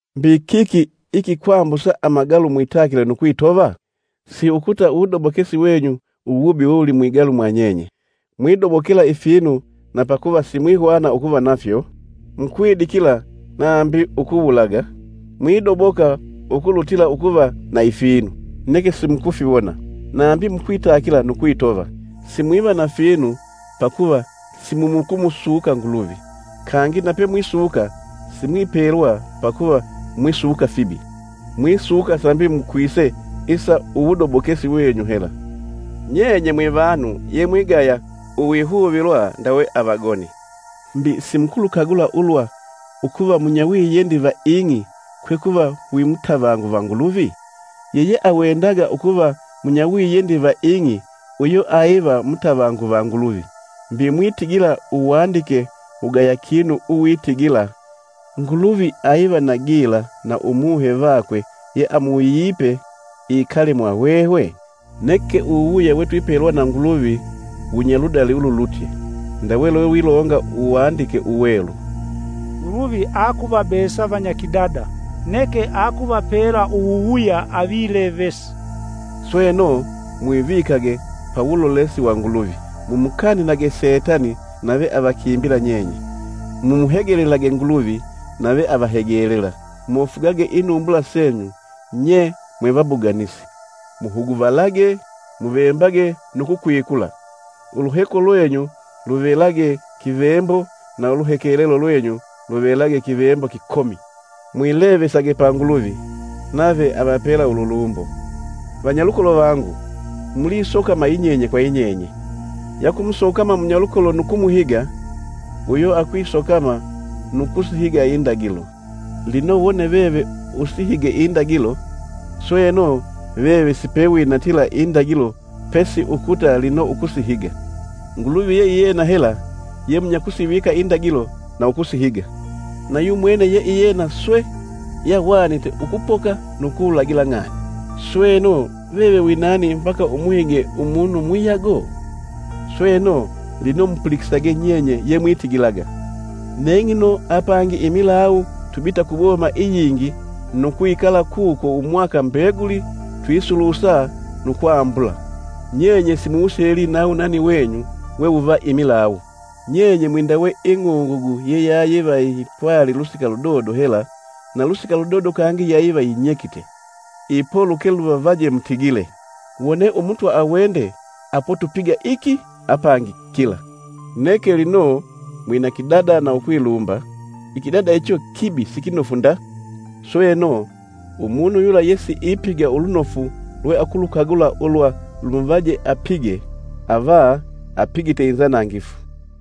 Mbi kiki ikikwambusa amagalu mwitakile nu kwitova? Siukuta uwudobokesi wenyu wewulimwigalu mwanyenye. Mwidobokela ifinu na pakuva simwihwana ukuva nafyo, mukwidikila nambi ukuwulaga; mwidoboka ukulutila ukuva na ifinu, neke simukufiwona; nambi mukwitakila nu kwitova. Simwiva na finu pakuva simumukumusuka Nguluvi. Kangi, napemwisuka simwipelwa pakuva mwisuka fibi, mwisuka sambi mukwise isa uwudobokesi wenyu hela. Nyenye mwivanu yemwigaya uwihuvilwa ndawe avagoni. Mbi simukulukagula ulwa ukuva munyawiyendi va ing'i kwe kuva wimutavangu va Nguluvi? Yeyeawendaga ukuva munyawiyendi va ing'i uyo ayiva mutavangu va Nguluvi. Mbi mwitigila uwandike wugaya kinu uwitigila, “Nguluvi aiva na gila na Umuhe vakwe yeamuwuyipe ikale mwahwehwe?” Neke uwuwuya wetwipelwa na Nguluvi wunyaludali ululutye; ndawe lwewilonga Uwandike Uwelu, Nguluvi akuvabesa vanyakidada, neke akuvapela uwuwuya Avilevesi. Sweno, mwivikage pa wulolesi wa Nguluvi; mumukanilage Setani nave avakimbila nyenye. Mumuhegelelage Nguluvi, nave avahegelela. Mofugage inumbula senyu nye mwevabuganisi! Muhuguvalage, muvembage nu kukwikula, uluheko lwenyu luvelage kivembo na uluhekelelo lwenyu luvelage kivembo kikomi. Mwilevesage pa Nguluvi, nave avapela ululumbo. Vanyalukolo vangu, mulisokama yinyenye kwa yinyenye. Yakumusokama munyalukolo nu kumuhiga, uyo akwisokama nu kusihiga Indagilo. Lino wone veve isihige Indagilo, sweno, veve sipewinatila Indagilo pesi ukuta lino ukusihiga. Nguluvi ye iyena hela yemunyakusivika Indagilo na ukusihiga. Na yumwene yeiyena swe yahwanite ukupoka nu kuwulagila ng'ani. Sweno, veve wi nani mbaka umuhige umunu muyago? Sweno, lino mupulikisage nyenye yemwitigilaga, “Neng'ino apangi imilawu tubita ku boma iyingi nu kwikala kuko umwaka mbeguli twisulusa nu kwambula,” Nyenye simuwuseli na wunani wenyu wewuva imilawu! Nyenye mwindawe ing'ungugu yeyayiva yipwali lusika ludodo hela na lusika ludodo kangi yayiva yinyekite. Ipo luke luvavaje mutigile, “Wone Umutwa awende apo tupiga iki apangi kila.” Neke, lino mwina kidada na ukwilumba, ikidada icho kibi sikinofu nda. Sweno, umunu yula yesiipiga ulunofu lweakulukagula ulwa lumuvaje apige ava apigite inzanangifu.